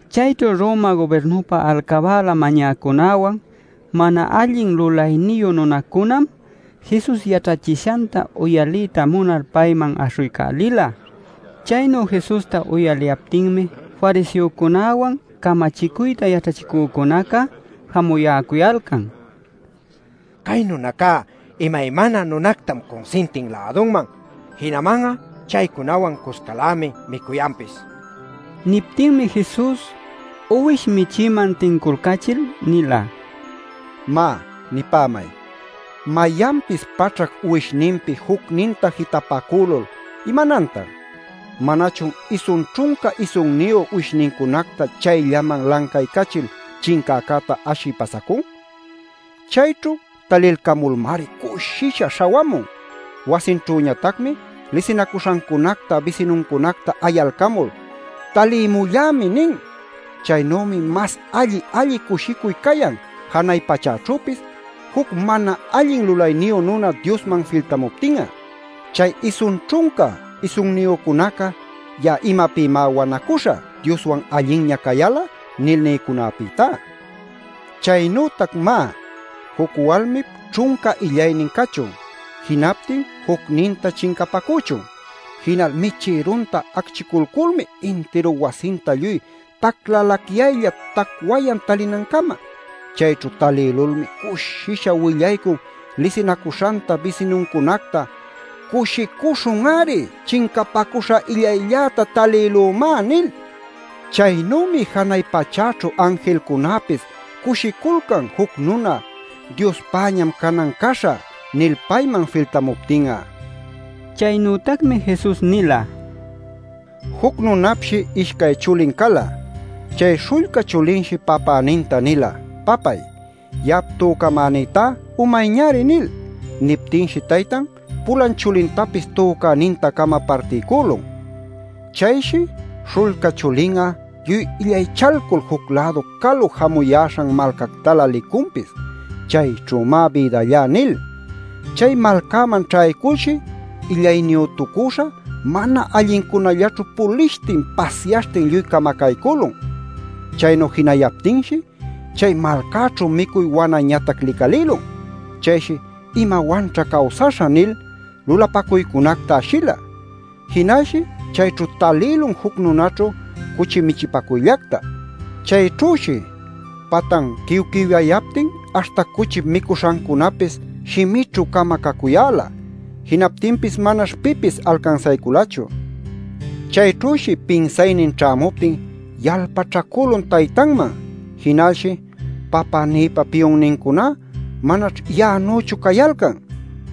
Chayćhu Roma gubirnupä alcabäla mañäcunawan mana allin lulayniyu nunacunam Jesus yaćhachishanta uyaliyta munal payman aśhuycälila. Chaynu Jesusta uyaliyaptinmi fariseocunäwan camachicuyta yaćhachicücunaca jamuyäcuyalcan: “Cay nunacá imaymana nunacunactam cunsintin lädunman. ¡Jinaman'a chaycunawan cuscalämi micuyanpis!” nil. Niptinmi Jesus uwish michïman tinculcachil nila: “Má, nipämay: Mayanpis paćhac uwishninpi jucninta jitapacülul ¿imanantan? ¿Manachun isun ćhunca isunniyu uwishnincunacta chayllaman lancaycachil chincäcäta ashï pasacun? Chayćhu talilcamulmari cushisha śhawamun. Wasinćhüñatacmi lisinacuśhancunacta bisinuncunacta ayalcamul ‘¡Talimullämi!’ nin. Chaynümi mas alli-alli cushicuy cayan janay pachäćhüpis, juc mana allin lulayniyu nuna Diosman filtamuptin'a, chay isun ćhunca isunniyücunaca ‘Ya'a imapïmá wanacuśhä Dioswan allinña cayal'a’ nil nïcunapïtá. “Chaynütac má, juc walmip ćhunca illaynin cachun. Jinaptin jucninta chincapacüchun. Jinal michïrunta acchiculculmi intiru wasinta lluy taclalacyaylla tacwayan talinancama. Chayćhu talïlulmi cushisha willaycun lisinacuśhanta, bisinuncunacta ‘¡Cushicuśhun-ari! ¡Chincapacuśha illaylläta talïlümá!’ nil. Chaynümi janay pachäćhu anjilcunäpis cushiculcan juc nuna ‘Diospäñam canan caśhä’ nil payman filtamuptin'a” nila. Chaynütacmi Jesus nila: “Juc nunapshi ishcay chulin cala. Chay śhullca chulinshi papäninta nila: ‘Papay, ya'ap tücamänïtá umayñari’ nil. Niptinshi taytan, pulan chulintapis tücäninta-cama partiycülun. “Chayshi śhullca chulin'a lluy illaychalcul juc-lädu calu jamuyäśhan malcactalä licunpis ‘¡Chayćhümá bïdallá!’ nil. Chay malcäman ćhayculshi illayniyütucüśha mana allincunallaćhu pulishtin pasyaśhtin lluy camacaycülun. Chaynu jinayaptinshi chay malcäćhu micuy wanañatac licalïlun. Chayshi ‘¿Imawanćha cawsaśhä?’ nil, lulapacuycunacta ashila. Jinalshi chayćhu talïlun juc nunaćhu cuchi michipacuyllacta. Chayćhüshi patan quiwquiwyayaptin aśhta cuchip micuśhancunapis shimićhü-cama cacuyäla. Jinaptinpis manash pipis alcansayculachu. “Chayćhüshi pinsaynin ćhämuptin yalpaćhacülun taytanman. Jinalshi: ‘Papänïpa piyunnincuná manaćh ya'anüchu cayalcan.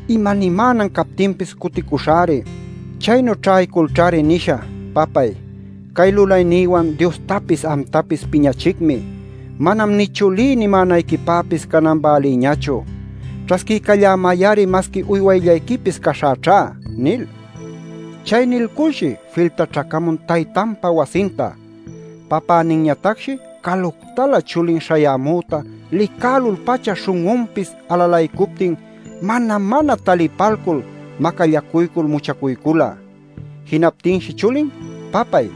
Imanimänan captinpis cuticuśhäri. Chaynu ćhayculćhari nishä: “Papay, cay lulaynïwan Diostapis amtapis piñachicmi. Manam nï chulí nimänayquipäpis canan bälïñachu. Ćhasquiycallämay-ari masqui uywayllayquipis caśhäćhá” nil’ nila. Chay nilculshi filtaćhacamun taytanpa wasinta. “Papäninñatacshi caluctalä chulin śhayämüta licälul-pacha śhun'unpis alalaycuptin mana-mana talipalcul macallacuycul muchacuycula. “Jinaptinshi chulin: ‘Papay,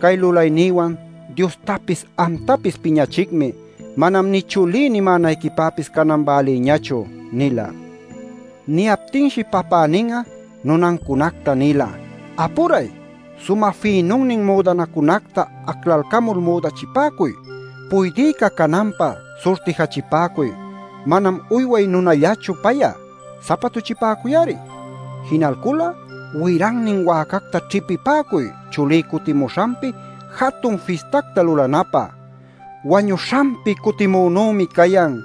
cay lulaynïwan Diostapis amtapis piñächicmi. Manam nï chulí nimänayquipäpis canan bälïñachu’ nila. Niyaptinshi papänin'a nunancunacta nila: ‘¡Apuray! Sumä fïnunnin müdanacunacta aclalcamul müdachipäcuy. Puydïca cananpä surtijachipäcuy. Manam uyway nunallachu pay'a; sapatuchipäcuy-ari. Jinalcul'a wirannin wäcacta ćhipipäcuy chulí cutimuśhanpi jatun fistacta lulanapä. ¡Wañuśhanpi cutimünümi cayan!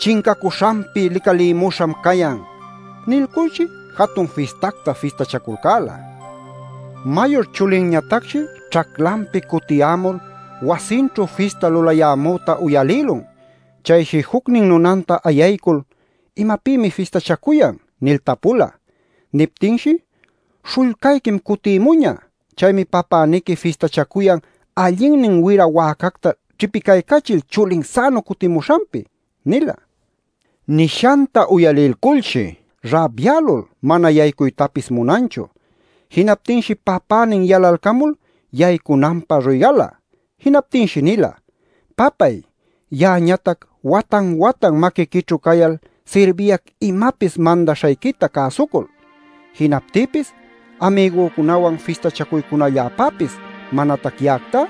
¡Chincacuśhanpi licalïmuśham cayan!’ Nilculshi jatun fistacta fistachaculcäla. “Mayur chulinñatacshi ćhaclanpi cutiyämul wasinćhu fista lüyayämüta uyalïlun. Chayshi jucnin nunanta ayaycul: ‘¿Imapïmi fistachacuyan?’ nil tapula. Niptinshi: ‘Śhullcayquim cutïmuñä. Chaymi papäniqui fistachacuyan allinnin wira wäcacta ćhipicaycachil chulin sänu cutimuśhanpi’ nila. “Nishanta uyalilculshi rabyälul mana yaycuytapis munanchu. Jinaptinshi papänin yalalcamul yaycunanpä ruygala. Jinaptinshi nila: ‘Papay, ya'añatac watan-watan maquiquićhu cayal sirbiyac imapis mandaśhayquita cäsucul. Jinaptïpis amigücunawan fistachacuycunalläpäpis manatac ya'actá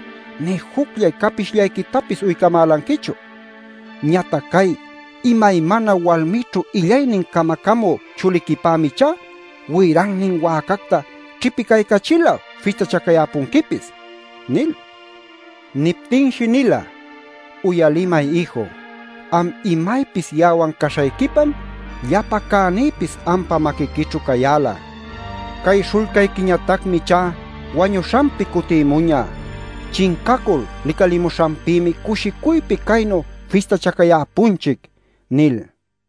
nï jucllay capishllayquitapis uycamälanquichu. ¡Ñatac cay imaymana walmićhu illaynin camacamü chuliquipämi ichá wirannin wäcacta ćhipiycachil'a fistachacayäpunquipis!’ nil. “Niptinshi nila: ‘Uyalimay ïju, am imaypis ya'awan caśhayquipam llapa cänïpis ampa maquiquićhu cayäla. Cay śhullcayquiñatacmi ichá wañuśhanpi cutïmuñä. Chincacul licalimuśhanpïmi cushicuypi caynu fistachacayäpunchic’ nil” nila.